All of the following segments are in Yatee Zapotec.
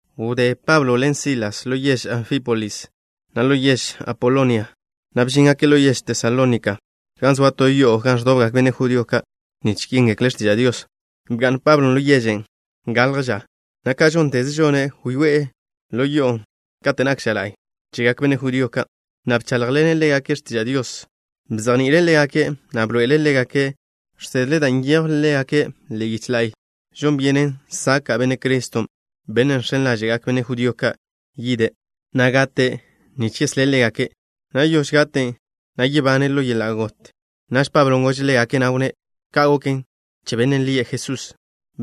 Wdé Pablo ḻen Silas ḻo yež Anfípolis, na' ḻo yež Apolonia, na' bžíngake' ḻo yež Tesalónika, gan zoa to yo'o gan ẕdobgak benne' judío ka' nich yéngekle' x̱tiža' Dios. Bga'n Pablon' ḻo yežen' galj ža, na' ka žónteze žone', wyoé'e yo'on' kate' nak ža la'y chegak benne' judío ka', na' bcháḻjḻene' ḻégake' x̱tiža' Dios. Bzejni'ile' ḻégake', na' bḻoe'ele' ḻégake' žsedle da' nyejw ḻe'e yiche la'y žon byenen saka' Benne' Criston', Bennen' žx̱en ḻáže'gak benne' judío ka' yide', na' gate' nich yeslé' ḻégake', na' te gate', na' yebane' ḻo yeḻa' got. Naž Pablon' gože' ḻégake', na' wnné': —Ka' goken che Bennen' lie' Jesús,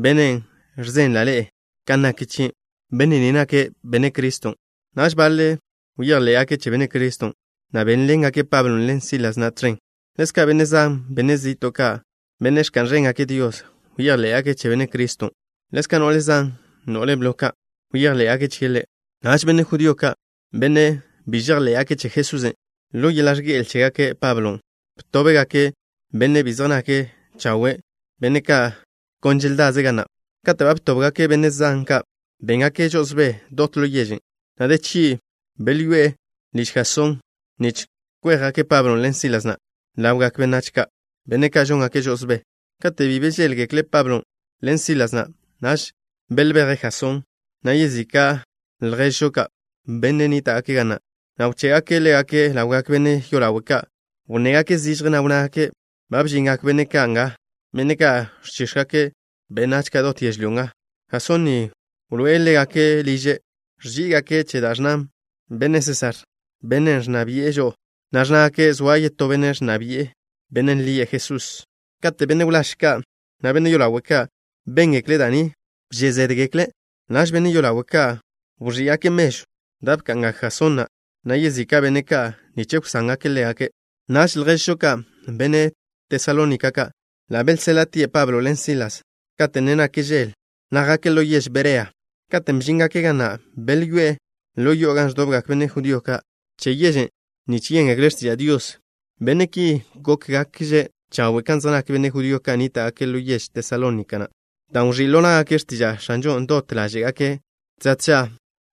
Bennen' ẕzenla' ḻe'e kan nak chie'. Benne' ni nake' Benne' Criston'. Naž baḻe' bejḻé'gake' che Benne' Criston', na' bénḻengake' Pablon' ḻen Sílasen' tẕen. Ḻezka' benne' zan, benne' zi'to' ka', benne' ẕka'n ẕéngake' Dios, bejḻé'gake' che Benne' Criston'. Ḻezka' no'le zan, no'le blo ka', bejḻé'gake' chie' Ḻe'. Naž benne' judío ka', benne' bi žejḻé'gake' che Jesusen', ḻo yeḻa' ẕge'el chégake' Pablo, btóbgake' benne' ka' bi zej nake' chawe', benne' ka' kon želdaze' ga na'. Kate' ba btóbgake' benne' zan ka', béngake' žo'osbé dot ḻo yežen', na' de chgi' belyoé'e liž Jasón nich kwéjgake' Pablon' ḻen Sílasen' ḻawgak benách ka', benne' ka' žóngake' žo'osbé. Kate' bi bžéḻgekle' Pablon' ḻen Sílasen', naž belbeje' Jasón, na' yezika' lježžo ka', benne' nníta'gake' ga na', na' bché'gake' ḻégake' ḻawgak benne' yolawe' ka'. Wnnégake' zižje, na' wnnágake': —Ba bžingak benne' ka' nga, benne' ka' ẕchíx̱gake' benách ka' dot yežlyó nga. Jasón ni wḻoé'e ḻégake' liže'. Ẕží'igake' che da' ẕnna benne' Sésar, bennen' ẕnna bi'e žo'o, na' ẕnnágake' zoa yetó benne' ẕnna bi'e, bennen' lie' Jesús. Kate' benne' wláž ka', na' benne' yolawe' ka', béngekle' da' ni, wžé' zédgekle'. Naž, benne' yolawe' ka' wẕí'gake' mežw da' bka'ngak Jasón na', na' yezika' benne' ka', nich wsángake' ḻégake'. Naž lježžo ka', benne' Tesalónika ka', ḻa' belséḻa'tie' Pablo ḻen Silas kate' ne nak žel, na' jake' ḻo yež Berea. Katen' bžíngake' ga na', belyoé'e ḻo yo'o gan ẕdobgak benne' judío ka' che yežen' nich yéngekle' x̱tiža' Dios. Benne' ki gókgakže' chawe' ka zej nak benne' judío ka' nníta'gake' ḻo yež Tesalónika, dan' wẕí' ḻo ná'gake' x̱tiža' X̱anžon' dot ḻáže'gake'. Tža tža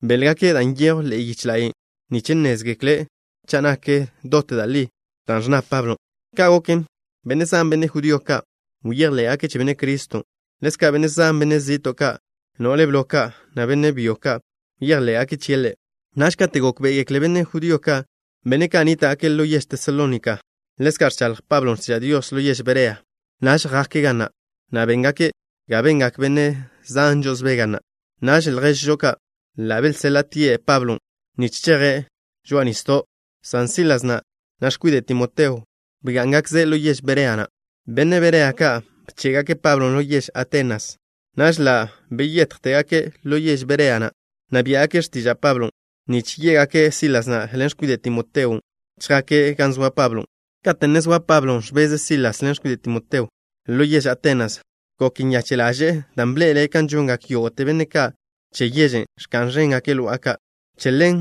béḻgake' da' nyejw ḻe'e yiche la'y, nich nnézgekle' cha' nak dot da' li dan' ẕnna Pablon'. Ka' goken, benne' zan, benne' judío ka', bejḻé'gake' che Benne' Criston'. Ḻezka', benne' zan, benne' zi'to' ka', no'le blo ka', na' benne' byo ka', bejḻé'gake' chie' Ḻe'. Naž kate' gókbe'egekle benne' judío ka', benne' ka' nníta'gake' ḻo yež Tesalónika, ḻezka' ẕchaḻj Pablon' x̱tiža' Dios ḻo yež Berea, naž jake' ga na', na' béngake' ga bengak benne' zan žo'osbé ga na'. Naž lježžo ka' ḻa' belséḻa'tie' Pablon', nich cheje' žoa'a nisdo', san Sílasen', na' x̱kwide' Timoteo, bgá'ngakze' ḻo yež Berea na'. Benne' Berea ka' bché'gake' Pablon' ḻo yež Atenas. Naž ḻa' beyéjtegake' ḻo yež Berea na', na' biá'gake' x̱tiža' Pablon', nich yé'gake' Sílasen' ḻen x̱kwide' Timoteon' chjaktie' gan zoa Pablon'. Kate' ne zoa Pablo ẕbeze' Silas ḻen x̱kwide' Timoteo, ḻo yež Atenas, gok nyache' ḻaže'e dan' bḻe'ele' kan žongak yógo'te benne' ka' che yežen', ẕka'n ẕéngake' lo'a ka'. Che ḻen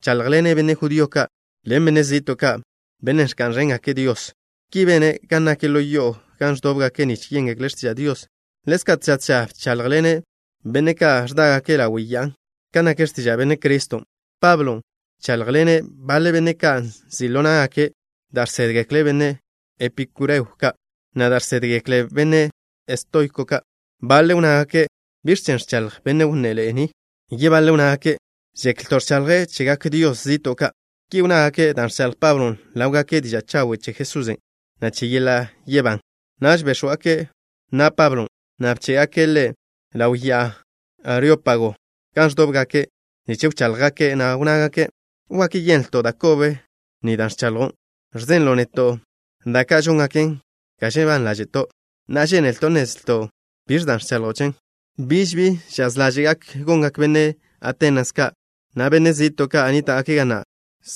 bcháḻjḻene' benne' judío ka' ḻen benne' zi'to' ka', benne' ẕka'n ẕéngake' Dios. Ki bene' gan nak ḻo yo'o gan ẕdóbgake' nich yéngekle' x̱tiža' Dios. Ḻezka' tža tža bcháḻjḻene' benne' ka' ẕdágake' ḻawe' ya'a kan nak x̱tiža' Benne' Criston'. Pablon' bcháḻjḻene' baḻe benne' ka' nzi' ḻo ná'gake' da' žsédgekle benne' epikúreo ka', na' da' žsédgekle benne' estoiko ka'. Baḻe' wnnágake': —¿Biẕ chen ẕchaḻj benne' wnneḻe'e ni? Yebaḻe' wnnágake': —Žeklto' ẕchaḻje' chegak dios zi'to' ka'. Ki wnnágake' dan' ẕchaḻj Pablon' ḻáwgake' diža' chawen' che Jesusen', na' che yeḻa' yebán. Naž béx̱wgake' na' Pablon', na' bché'gake' ḻe' ḻaw Ya'a Areópago, gan ẕdóbgake' nich wcháḻjgake', na' wnnágake': —¿Wak yenlto' da' kobe ni da' ẕchaḻjo' chen? Ẕzenlo' neto' da' ka' žóngaken ga žebán ḻáže'to'. Na'a, žénelto' nnezlto' biẕen' dan' ẕchaḻjo' chen. Biž bi žaz ḻáže'gak gongak benne' Atenas ka', na' benne' zi'to' ka' nníta'gake' ga na',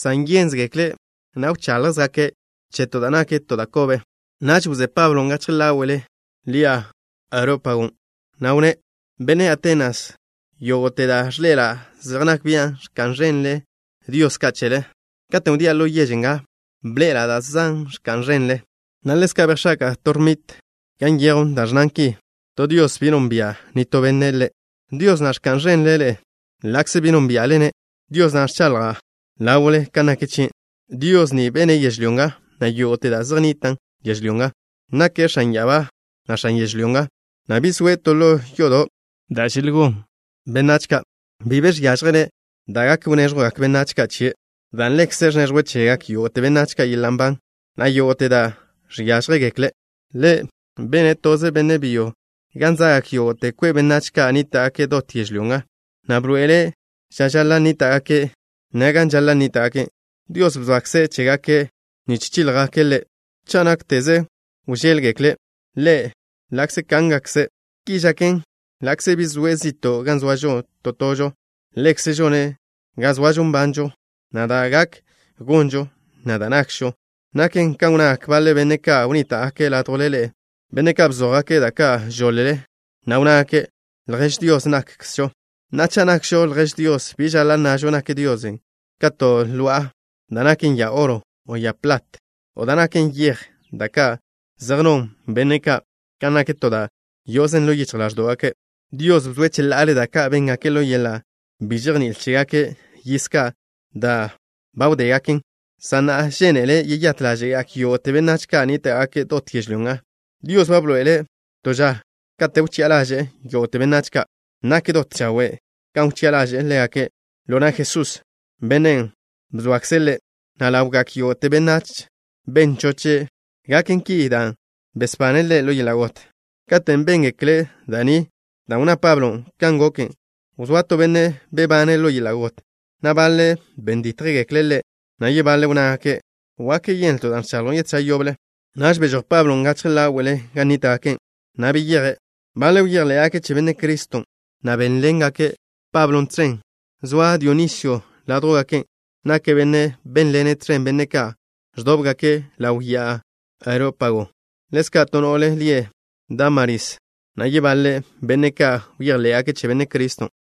san žénzegekle', na' ẕcháḻjzegake' che to da' kobe. Naž wzé Pablon' gachje ḻáwe'le ḻi'a Areópagon', na' wnné': —Benne' Atenas ka', yógo'te da' ẕḻe'ela' zej nak bian' ẕka'n ẕénḻe'ele dios ka' chele. Katen' wdía' ḻo yež nga bḻe'ela' da' zan da' ẕka'n ẕenle, na' ḻezka' bejx̱aka'a to nichw gan nyejw da' ẕnnan ki: “To Dios, Bi Nonbia' Nitó Benne' Ḻe'.” Dios na' ẕka'n ẕenle-ne' ḻa'kze bi nónbia'le-ne', Dios na' ẕchaḻja' ḻawle kan nak chie'. ’Dios ni bene' yežlyó nga, na' yógo'te da' zej nnitan' yežlyó nga. Nake' X̱an ya'abá, na' X̱an yežlyó nga, na' bi zoe' to ḻo yodo' da' zej non benách ka'. Bi be žiážjele' da' gak wnéẕjwgak benne' ka' chie', dan' Ḻekze' ẕneẕjwe' chegak yógo'te benách yeḻa' nban, na' yógo'te da' žiážjegekle'. ’Ḻe' bene' toze benne' byo gan za'gak yógo'te kwe' benách ka' nníta'gake' dot yežlyó nga, na' bḻoe'ele' ža žaḻa' nníta'gake', na' gan žaḻa' nníta'gake'. Dios bzoakze' chégake' nich chíljgake' Ḻe', cha' nákteze wžéḻgekle' Ḻe' ḻa'kze kángakze'. Ki žaken ḻa'kze bi zoe' zi'to' gan zoažo to tožo. Ḻekze' žone' ga zoažo nbanžo, na' da' gak gonžo, na' da' nakžo. Naken kan wnnagak baḻe benne' ka' wnníta'gake' ládjwle ḻe'e, benne' ka' bzójgake' da' ka' žoḻ-le, na' wnnágake': “Ljež Dios nakžo.” Na'a, cha' nakžo ljež Dios, bi žaḻa' nnažo nak Dios ka to lo'a da' naken ya oro, o ya plat, o da' naken yej, da' ka' zej non benne' ka' kan nak to da' yo'ozen ḻo yichj ḻáẕdo'gake'. Dios bzoe' cheḻa'ale da' ka' béngake' ḻo yeḻa' bi žejní'il chégake' yiz ka' da' ba wdégaken, san na'a žénele' yeyát ḻáže'gak yógo'te benách ka' nníta'gake' dot yežlyó nga. Dios ba bḻoe'ele' to ža kate' wchi'a ḻaže'e yógo'te benách ka'. Nak dot chawe' kan wchi'a ḻaže'e ḻégake' ḻo na' Jesús, Bennen' bzoakze' Ḻe', na' ḻawgak yógo'te benách ben choche' gaken ki dan' besbane' Ḻe' ḻo yeḻa' got. Katen' béngekle' da' ni dan' wnná Pablo kan goken, wzóa to benne' bebane' ḻo yeḻa' got, na' baḻe' ben dítjgekle' Ḻe', na' yebaḻe' wnnágake': —Wak yenlto' da' ẕchaḻjo' chen ža yoble. Naž bežój Pablon' gachje ḻáwe'le gan nníta'gake', na' beyeje'. Baḻe' bejḻé'gake' che Benne' Criston', na' bénḻengake' Pablon' tẕen. Zoa Dionisio ládjwgake'. Nake' benne' bénḻene' tẕen benne' ka' ẕdóbgake' ḻaw ya'a Areópago. Ḻezka' to no'le lie' Dámaris, na' yebaḻe benne' ka' bejḻé'gake' che Benne' Criston'.